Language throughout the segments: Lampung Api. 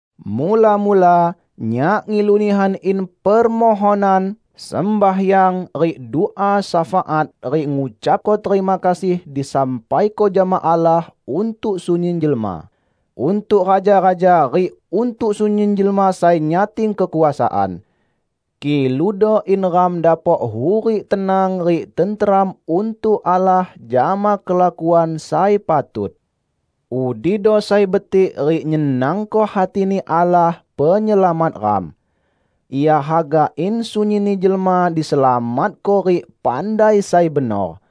Mula-mula, nyak ngilu nihan in permohonan, sembahyang, rik dua syafaat rik ngucapko terima kasih disampaiko jama Allah untuk sunyin jelma; untuk raja-raja rik untuk sunyin jelma sai nyating kekuasaan. Kiludo in ram dapok hurik tenang rik tenteram untuk Allah jama kelakuan sai patut. Udido sai betik rik nyenangko hati-Ni Allah, Penyelamat ram. Ia haga in sunyinni jelma diselamatko rik pandai sai benor.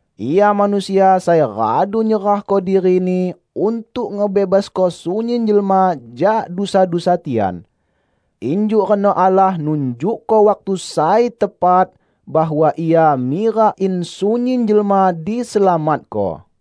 Ia manusia sai radu nyerahko diri-Ni untuk ngebebasko sunyin jelma jak dusa-dusa tian. Injuk reno Allah nunjukko waktu sai tepat, bahwa Ia mirak in sunyin jelma diselamatko.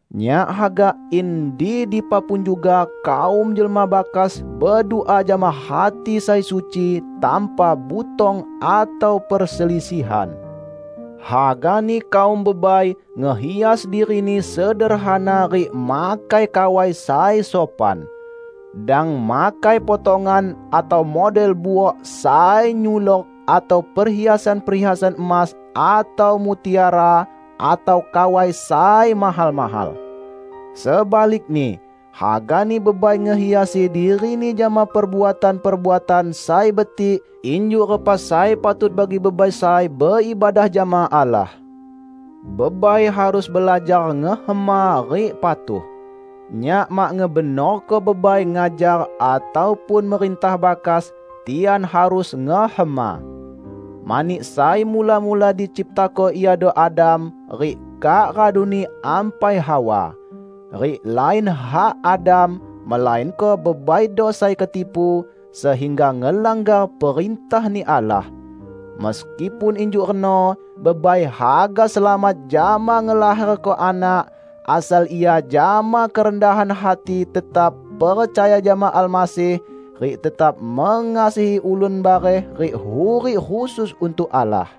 Nyak haga in di dipa pun juga kaum jelma bakas bedua jama hati sai suci, tanpa butong atau perselisihan. Hagani kaum bebai ngehias dirini sederhana rik makai kawai sai sopan. Dang makai potongan/model buok sai nyulok atau perhiasan-perhiasan emas atau mutiara, atau kawai sai mahal-mahal. Sebalikni, hagani bebai ngehiasi dirini jama perbuatan-perbuatan sai betik injuk repa sai patut bagi bebai sai beibadah jama Allah. Bebai harus belajar ngehema rik patuh. Nyak mak ngebenorko bebai ngajar ataupun merintah bakas; tian harus ngehema. Mani sai mula-mula diciptako iado Adam rik kak raduni ampai Hawa. Rik lain hak Adam, melainko bebaido sai ketipu, sehingga ngelanggar perintah-Ni Allah. Meskipun injuk reno, bebai haga selamat jama ngelaherko anak, asal ia jama kerendahan hati tetap percaya jama Almasih rik tetap mengasihi ulun bareh rik hurik khusus untuk Allah.